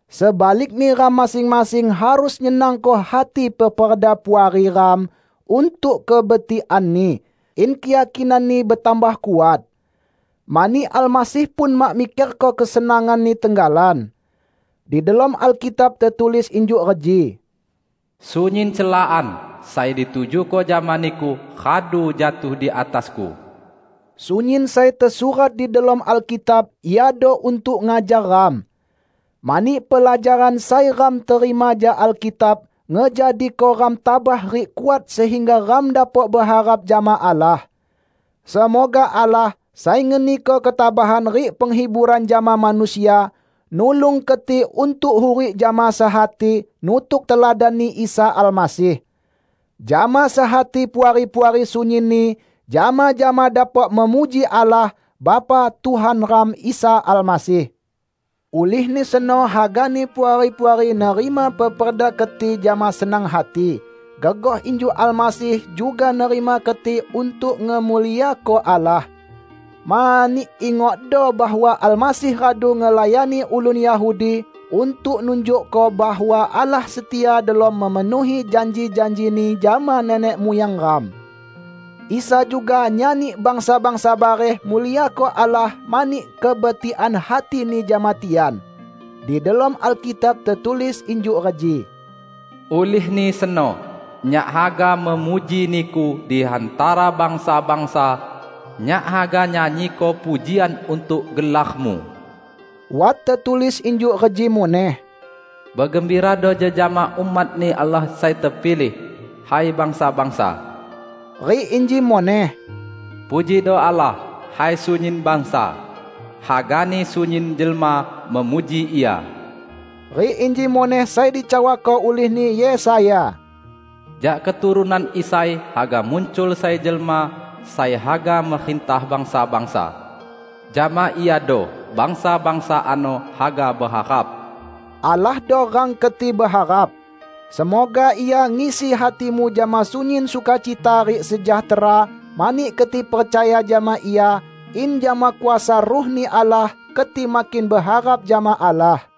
Sebalikni ram masing-masing harus nyenangko hati peperda puari ram untuk kebetikanni, in keyakinanni betambah kuat. Mani Almasih pun mak mikerko kesenangan-Ni tenggalan. Di delom Alkitab tetulis injuk reji, "Sunyin celaan sai ditujuko jama Niku radu jatuh di atasku." Sunyin sai tesurat di delom Alkitab iado untuk ngajar ram. Mani pelajaran sai ram terima jak Alkitab ngejadiko ram tabah rik kuat sehingga ram dapok beharap jama Allah. Semoga Allah, sai ngeniko ketabahan rik penghiburan jama manusia, nulung keti untuk hurik jama sehati, nutuk teladan-Ni Isa Almasih. Jama sehati Puari-puari sunyinni jama-jama dapok memuji Allah, Bapa Tuhan ram Isa Almasih. Ulihni seno hagani Puari-puari nerima peperda keti jama senang hati, gegoh injuk Almasih juga nerima keti untuk ngemuliako Allah. Mani, ingokdo, bahwa Almasih radu ngelayani ulun Yahudi untuk nunjukko bahwa Allah setia delom memenuhi janji-janji-Ni jama nenek muyang ram. Isa juga nyani bangsa-bangsa bareh muliako Allah mani kebetikan hati-Ni jama tian. Di delom Alkitab tetulis injuk reji, "Ulihni seno nyak haga memuji Niku di hantara bangsa-bangsa, nyak haga nyanyiko pujian untuk gelar-Mu." Wat tetulis injuk reji muneh, "Begembirado jejama umat-Ni Allah sai tepilih, hai bangsa-bangsa!" Rik inji muneh, "Pujido Allah, hai sunyin bangsa, hagani sunyin jelma memuji Ia!" Rik inji muneh sai dicawako ulihni Yesaya, "Jak keturunan Isai haga muncul sai jelma sai haga merintah bangsa-bangsa; jama Iado bangsa-bangsa ano haga beharap." Allahdo rang keti beharap. Semoga Ia ngisi hatimu jama sunyin sukacita rik sejahtera mani keti percaya jama Ia, in jama kuasa Ruh-Ni Allah keti makin beharap jama Allah.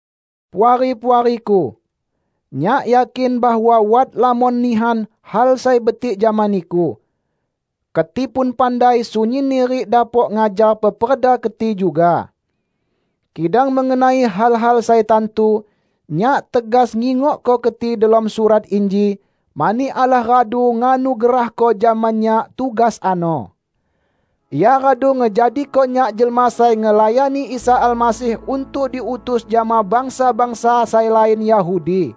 Puari-puariku! Nyak yakin bahwa wat lamon nihan hal sai betik jama niku. Keti pun pandai sunyinni rik dapok ngajar peperda keti juga. Kidang mengenai hal-hal sai tantu, nyak tegas ngingokko keti delom surat inji, mani Allah radu nganugerahko jama nyak tugas ano. Ia radu ngejadiko nyak jelma sai ngelayani Isa Almasih untuk diutus jama bangsa-bangsa sai lain Yahudi.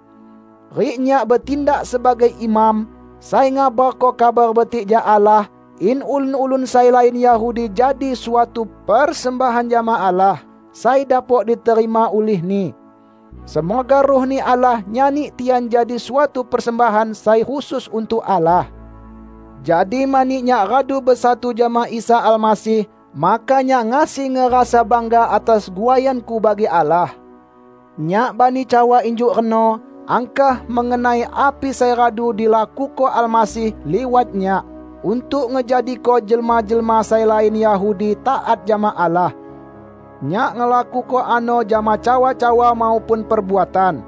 Rik nyak betindak sebagai imam, sai ngabarko Kabar Betik jak Allah, in ulun-ulun sai lain Yahudi jadi suatu persembahan jama Allah sai dapok diterima ulih-Ni. Semoga Ruh-Ni Allah nyani tian jadi suatu persembahan sai khusus untuk Allah. Jadi mani nyak radu besatu jama Isa Almasih, maka nyak ngasi ngerasa bangga atas guaianku bagi Allah. Nyak bani cawa injuk reno angkah mengenai api sai radu dilakuko Almasih liwat nyak untuk ngejadiko jelma-jelma sai lain Yahudi taat jama Allah. Nyak ngelakuko ano jama cawa-cawa maupun perbuatan,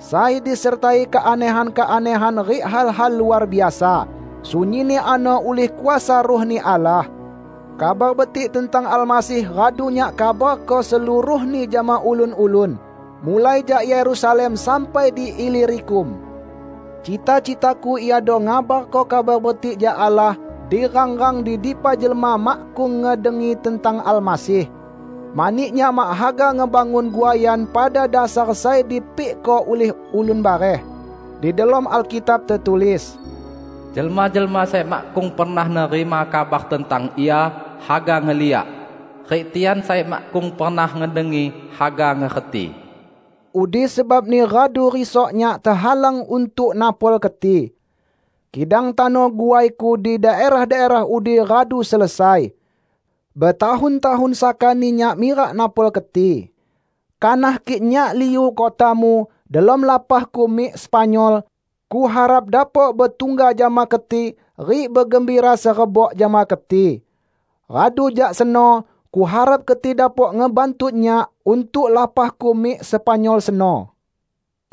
sai disertai keanehan-keanehan rik hal-hal luar biasa; sunyinni ano ulih kuasa Ruh-Ni Allah. Kabar Betik tentang Almasih radu nyak kabarko seluruhni jama ulun-ulun, mulai jak Yerusalem sampai di Ilirikum. Cita-citaku iado ngabarko Kabar Betik jak Allah di rang-rang di dipa jelma makkung ngedengi tentang Almasih. Mani nyak mak haga ngebangun guaian pada dasar sai dipikko ulih ulun bareh. Di delom Alkitab tetulis, "Jelma-jelma sai makkung pernah nerima kabar tentang Ia haga ngeliak; rik tian sai makkung pernah ngedengi, haga ngerti." Udi sebabni radu risok nyak tehalang untuk napol keti. Kidang tano guaiku di daerah-daerah udi radu selesai. Betahun-tahun sakani nyak mirak napol keti. Kanah kik nyak liu kotamu delom lapahku mik Spanyol, kuharap dapok betungga jama keti rik begembira serebok jama keti. Radu jak seno kuharap keti dapok ngebantu nyak untuk lapahku mik Spanyol seno.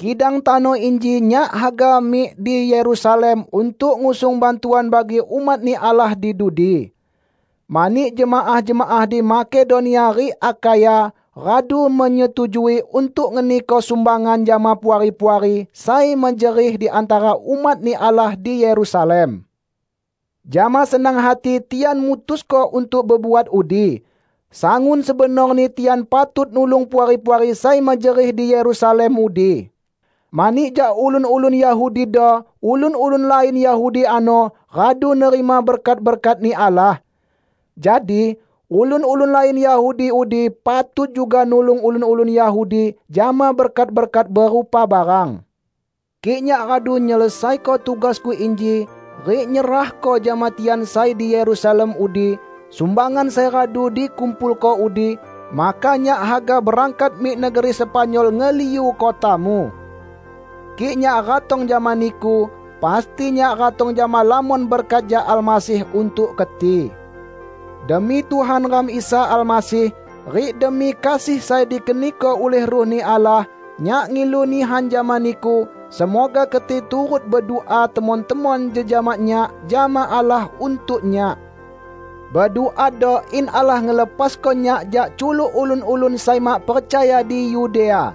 Kidang tano inji nyak haga mik di Yerusalem untuk ngusung bantuan bagi umat-Ni Allah di dudi. Mani jemaah-jemaah di Makedonia rik Akhaya radu menyetujui untuk ngeniko sumbangan jama puari-puari sai mejerih di hantara umat-Ni Allah di Yerusalem. Jama senang hati tian mutusko untuk bebuat udi. Sangun sebenorni tian patut nulung puari-puari sai mejerih di Yerusalem udi; mani jak ulun-ulun Yahudido ulun-ulun lain Yahudi ano radu nerima berkat-berkat-Ni Allah. Jadi, ulun-ulun lain Yahudi udi patut juga nulung ulun-ulun Yahudi jama berkat-berkat berupa barang. Kik nyak radu nyelesaiko tugasku inji, rik nyerahko jama tian sai di Yerusalem udi sumbangan sai radu dikumpulko udi, maka nyak haga berangkat mik negeri Spanyol ngeliu kotamu. Kik nyak ratong jama niku, pasti nyak ratong jama lamon berkat jak Almasih untuk keti. Demi Tuhan ram Isa Almasih, rik demi kasih sai dikeniko ulih Ruh-Ni Allah, nyak ngilu nihan jama niku, semoga keti turut bedua temon-temon jejama nyak jama Allah untuk nyak. Beduado in Allah ngelepasko nyak jak culuk ulun-ulun sai mak percaya di Yudea,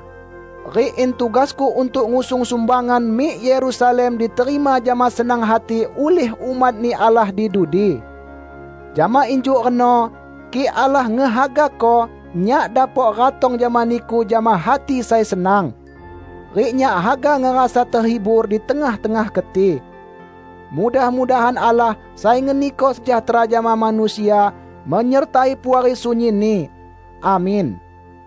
rik in tugasku untuk ngusung sumbangan mik Yerusalem diterima jama senang hati ulih umat-Ni Allah di dudi. Jama injuk reno, kik Allah ngehagako, nyak dapok ratong jama niku jama hati sai senang. Rik nyak haga ngerasa tehibur di tengah-tengah keti. Mudah-mudahan Allah, sai ngeniko sejahtera jama manusia, menyertai Puari sunyinni. Amin.